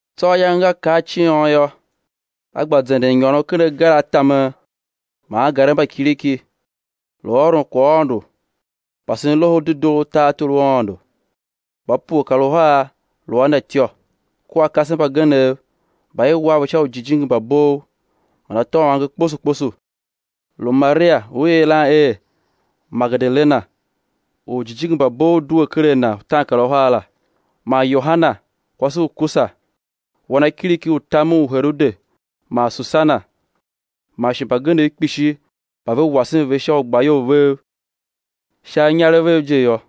Tsô ayange nga kar ciôn yô, A gba zenden nyôron ken agar a tamen man angarev mba kiriki, lu ôron kwaghaôndo, pasen Loho u Dedoo u tartor u Aôndo; mba pue kar uhar lu a Na ityô, kua kasev mbagenev mba i war ve sha ujijingi mba bov man atô a uange kposo kposo, lu Maria u i yilan er Magedalena, u ujijingi mba bov due ker a na utaankaruhar la, man Yoana kwase u Kusa, wanakiriki u tamen u Herode man Susana, man shi mbagenev kpishi mba ve wasen ve sha ugbayol vev sha inyarev vev je yô.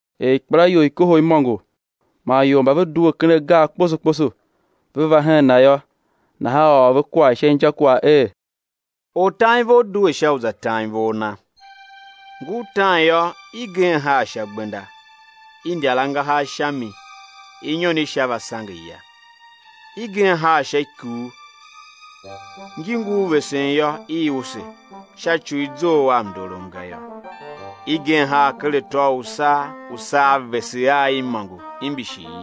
Er ikpelaior i kohol imôngo, man ior mba ve due ken agar kposo kposo, ve va hen Na yô, nahan A ôr ve kwagh sha injakwagh er: Ortanivor due sha u za tan ivor na. Ngur tan yô, igen haa sha gbenda; i ndyar angahar sha mi, inyon i sha va sange, ya. Igen haa sha ikuu; ngi ngur vesen yô, i use, sha ci u i zough a mndorom ga yô. Igen haa ker atô u usaa; usaa vese a i imôngo imbishi i.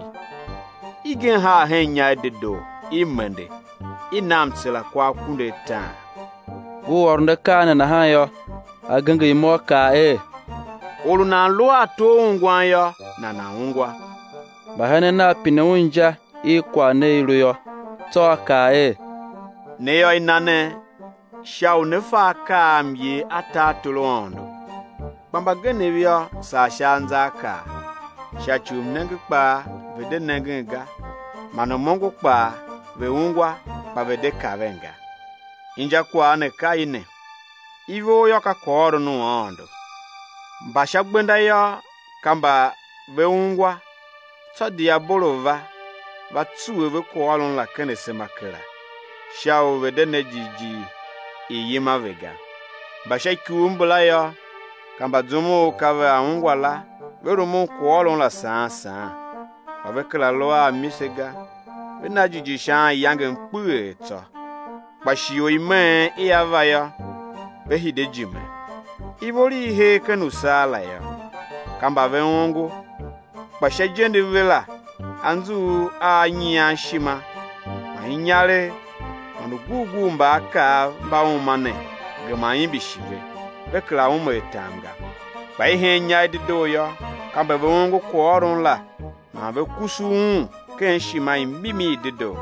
Igen haa hen inya i dedoo; i mende, i na mtsera kwa akunduataan. Ngur ôron akaa ne nahan yô, A genger imo A kaa er: Or u nan lu a ato a ungwan yô, nana̱ ungwa. Mbahenen Nav pine Un er inja i kwagh ne i lu yô. Tsô A kaa er: Ne yô, i na ne sha u né fa akaa a myer a tartor u Aôndo; kpa mbagenev yô, saa sha anzaakaa, sha ci u mnenge kpaa ve̱ de nengen ga, man m-ongo kpaa, ve̱ ungwa kpa ve̱ de kaven ga. Injakwagh ne ka i ne: Ivor yô, ka kwaghôron u Aôndo. Mba sha gbenda yô, ka mba ve ungwa tsô diabolo va, va tsuwe ve kwaghôron la ken asema kera, sha u ve̱ de ne jighjigh i̱ yima ve ga. Mba sha ikuu mbala yô, ka mba zum u ka vea ungwa la ve rumun kwaghôron la saan saan, kpa ve kera lu a amise ga, ve na jighjigh sha anyangem kpeghee tsô, kpa shighe u imeen ia va yô, ve hide ijime. Ivor i i hee ken usaa la yô, ka mba ve ongo, kpa sha ijende ve la anzughul a nyian ishima man inyaregh man ugurgurmbaakaav mba uma ne gema imbishi ve, ve kera ume atam ga. Kpa i hen inya i dedoo yô, ka mba ve ongo kwaghôron la man ve kusu un ken ishima i mimi i dedoo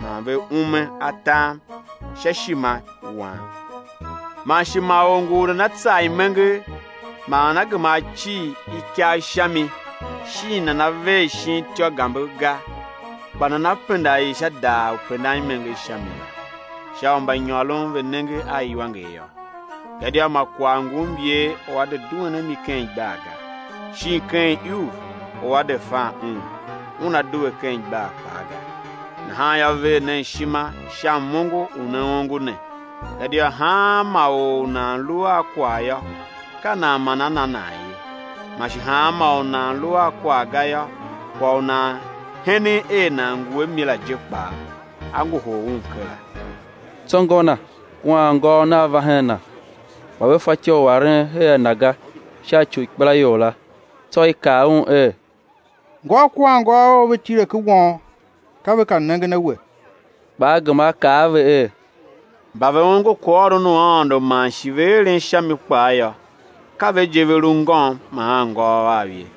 man ve ume atam sha ishimawan. Man shi ma or ngu u nana tsar imenger man nana gema á cir ikagh sha mi, shin nana ver shin ityô gambe ga; kpa nana penda i sha daar u pendan imenger sha mi la, sha u mbanyôron ve̱ nenge a iwanger yô. Gadia ma kwagh ngu myer u á de duen a mi ken igbar ga; shin ken iuv u á de fan un, una due ken igbar kpaa ga. Nahan yô, ver nen ishima sha m-ongo u ne ongo ne, gadia hanma or u nan lu a kwagh yô, ka nan man á na nan ye; man shi hanma or u nan lu a kwagh ga yô, kwagh u nan henen er nan ngu a mi la je kpaa, á ngohol un kera. Tsô ngô Na kua anngôôv Nav va hen Na, kpa ve fatyô u aren her a Na ga, sha ci u ikpelaior la. Tsô i kaa Un er: Ngôu kua anngôôv Ou ve tile ken won, ka ve ka nengen a We. Kpa A gema A kaa a ve er: Mba ve ongo kwaghôron u Aôndo, man shi ve eren sha mi kpaa yô, ka ve je, ve lu ngôm man anngôôv Av ye.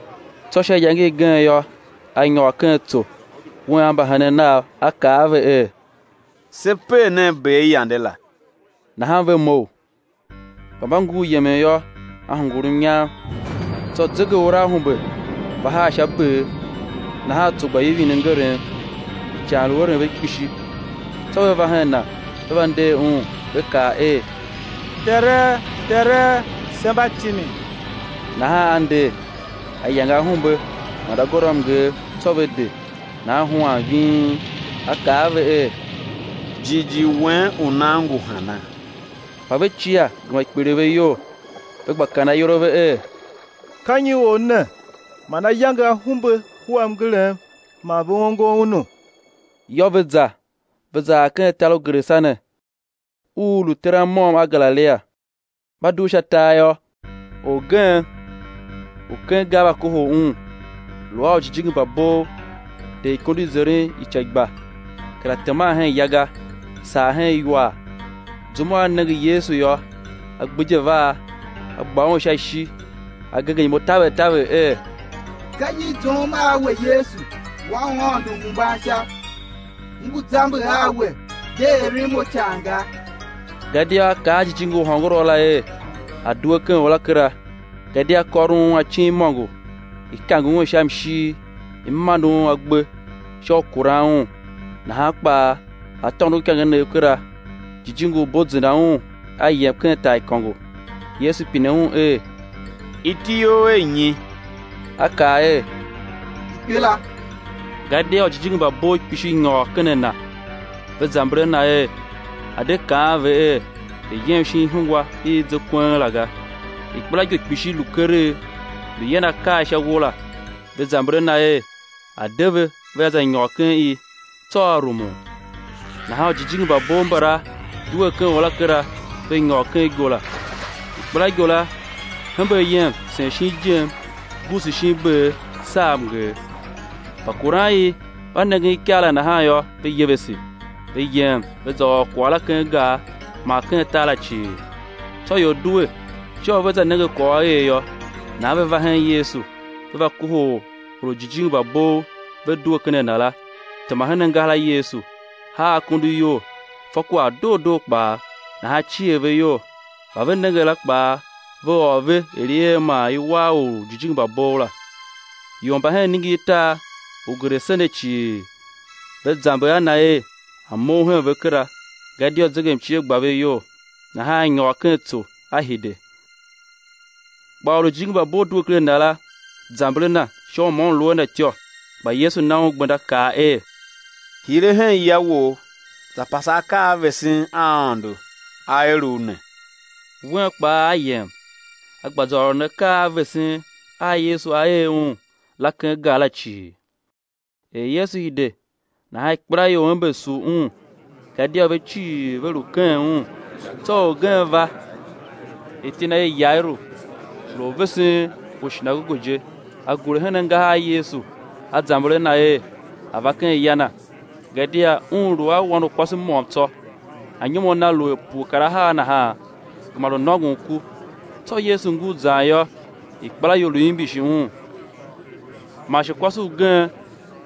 Tsô sha iyange igen yô, A nyôr ken tso, Wen a mbahenen Nav, A kaa a ve er: Se per nen ber yande la; nahan ve mough. Kpa mba ngur yemen yô, A hungul mnyam, tsô zegeuraahumbe va haa sha ber; nahan tso gba ivin mngerem, ican lu eren ve kpishi. Tsô ve va hen Na, ve va nder Un, ve kaa er: Tere, Tere, se mba timin! Nahan A nder, A yange ahumbe man agôndoamnger; tsô ve de, nahan huan ving. A kaa a ve er: Jighjigh wen u nan ngu hana? Kpa er ve cia gema kpiligh ve iyol, ve gba kaan ayol a ve er: Ka nyi Or ne man A yange ahumbe kua mngerem man ve ongo Unu? Yô, ve za, ve za ar ken tar u Gerasene u u lu teran môm a Galilia. Mba dugh sha tar yô, orgen u ken gar va kohol Un, lu a ujijingi mba bov, de ikondo i zeren ica i gba, kera teman hen ya ga, saa hen iwar. Zum u a nenge a Yesu yô, a gbidye vaa, a gba Un sha ishi, a genger imo taver taver er: Ka nyi i zoughom a we Yesu, Wan u Aôndo Uhembansha? M ngu zamber a We, de eren mo ican ga. Gadia A kaa a jijingi u hôngorough la er, a̱ due ken or la kera; gadia kôron un acin imôngo; i kange un sha mshir i mande un agbe sha u kuran un, nahan kpaa a tôndo ikangenev kera, jijingi u bo zenda un a yem ken taaikôngo. Yesu pine un er: Iti you er nyi? A kaa er: Ikpela; gadia ujijingi mba bov kpishi nyôr ken a na. Ve zamber a Na er, A̱ de kaan ve er, ve̱ yem shin ihungwa i i ze kweng la ga. Ikpelaigo kpishi lu keregh, lu yan akaa sha uwo la; ve zamber a Na er, A̱ de ve vea za nyôr ken i. Tsô A rumun. Nahan ujijingi mba bov mbala due ken or la kera, ve nyôr ken igo la. Ikpelaigo la hembe ayem sen shin ijem guusu shin ber, saa mnger. Mbakuran i mba nengen ikaa la nahan yô, ve yevese; ve yem ve za ôr kwagh la ken gar man ken tar la cii. Tsô ior due sha u vea za nenge kwagh u a er yô; nahan ve va hen Yesu, ve va kohol or u ujijingi mba bov ve due ken a na la, tema hen angahar a Yesu, haa akondo iyol, fa kwagh doo doo kpaa, nahan cier ve iyol. Mba ve nenge la kpaa ve ôr ve er i er man i war or u ujijingi mba bov la. Ior mba hen iningirtar u Gerasene cii, ve zamber a na er, A̱ mough hen ve kera, gadia zegemcie gba ve iyol, nahan a nyôr ken tso, A hide. Kpa or u ujijingi mba bov due ker a na la, zamber a Na sha u ma un lu a Na ityô. Kpa Yesu na un gbenda kaa er: Hire hen ya wou, za pase akaa a vesen a Aôndo A er u ne. Wen kpaa a yem, a gba za ôron akaa a vesen a Yesu A er un la ken gar la cii. Er Yesu hide nahan ikpelaior ember sugh Un, gadia ve cii ve lu keghen Un. Tsô orgen va, iti na er Yairu, lu orvesen u shinagoge je. A gure hen angahar a Yesu a zamber a Na er, A̱ va ken ya na; gadia un lu a wan u kwase môm tsô, anyom a na lu er pue kar ahar nahan, gema lu nôngon ku. Tsô Yesu ngur zan yô, ikpelaior lu imbishi Un. Man shi kwase ugen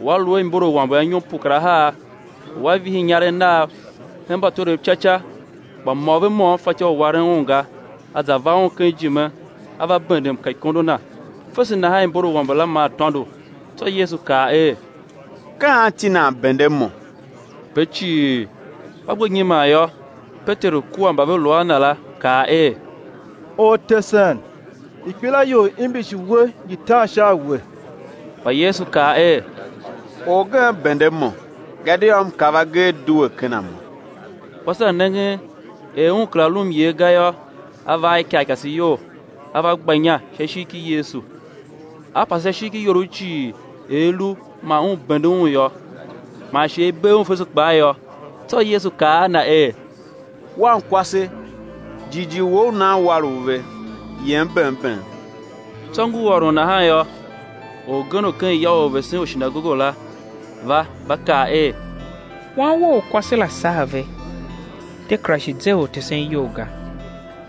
u a lu a imborawambe anyom pue kar ahar, u a vihi inyarev nav hen mbatwerev ca ca, kpa mô ve môm fatyô u waren un ga, a za va Un ken ijime a va bende mka ikondo Na; fese nahan imbor i awambe la maa tôndo. Tsô Yesu kaa er: Ka anti nan bende Mo? Ve cii mba gbe nyiman yô, Peteru kua mba ve lu a na la kaa er: Ortesen, ikpelaior imbishi We ngi tan sha a We. Kpa Yesu kaa er: Orgen bende Mo, gadia M kav agee due ken a Mo. Kwase la nengen er un kera lu myer ga yô, a va a ikarikase iyol, a va gba inya sha ishigh ki Yesu, a pase sha ishigh ki iorough cii er i lu man un bende Un yô, man shi er i bee un fese kpaa yô. Tsô Yesu kaa a na er: Wankwase, jighjigh wou u nan war u ve, yem bem bem. Tsô ngur ôron nahan yô, orgen u ken ya u orvesen u shinagoge la va, va kaa er: Wan wou u kwase la saa ve, de kera shi ze Ortesen iyol ga.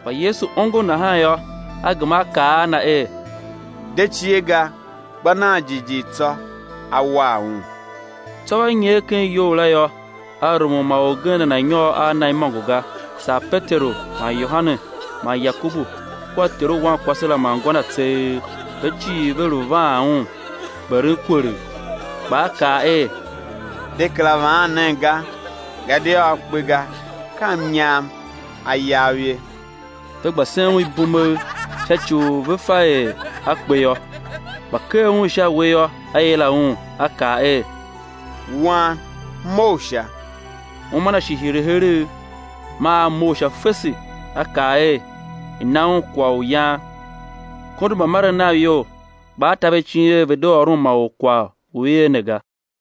Kpa Yesu ongo nahan yô, A gema A kaa a na er: De cie ga, gba nan jighjigh tsô, á war un. Tsô va nyer ken iyou la yô, A rumun ma orgen nana̱ nyôr a Na imôngo ga, saa Peteru man Yohane man Yakobu kua ter u wankwase la man ngô na tseegh. Ve cii ve lu vaan un, gberen kwelegh. Kpa A kaa er: De kera vaan nen ga, gadia a kpe ga, ka mnyam a yav ye. Ve gba sen Un ibumegh, sha ci u ve fa er a kpe yô. Kpa ker un sha uwe yô, A yila un, A kaa er: Wan, mough sha! Uma na shi hire heregh, maa a mough sha fese; A kaa er, i̱ na un kwagh u yan. Kondo mbamaren nav iyol; kpa A ta ve icin er ve̱ de ôron ma or kwagh u i er ne ga.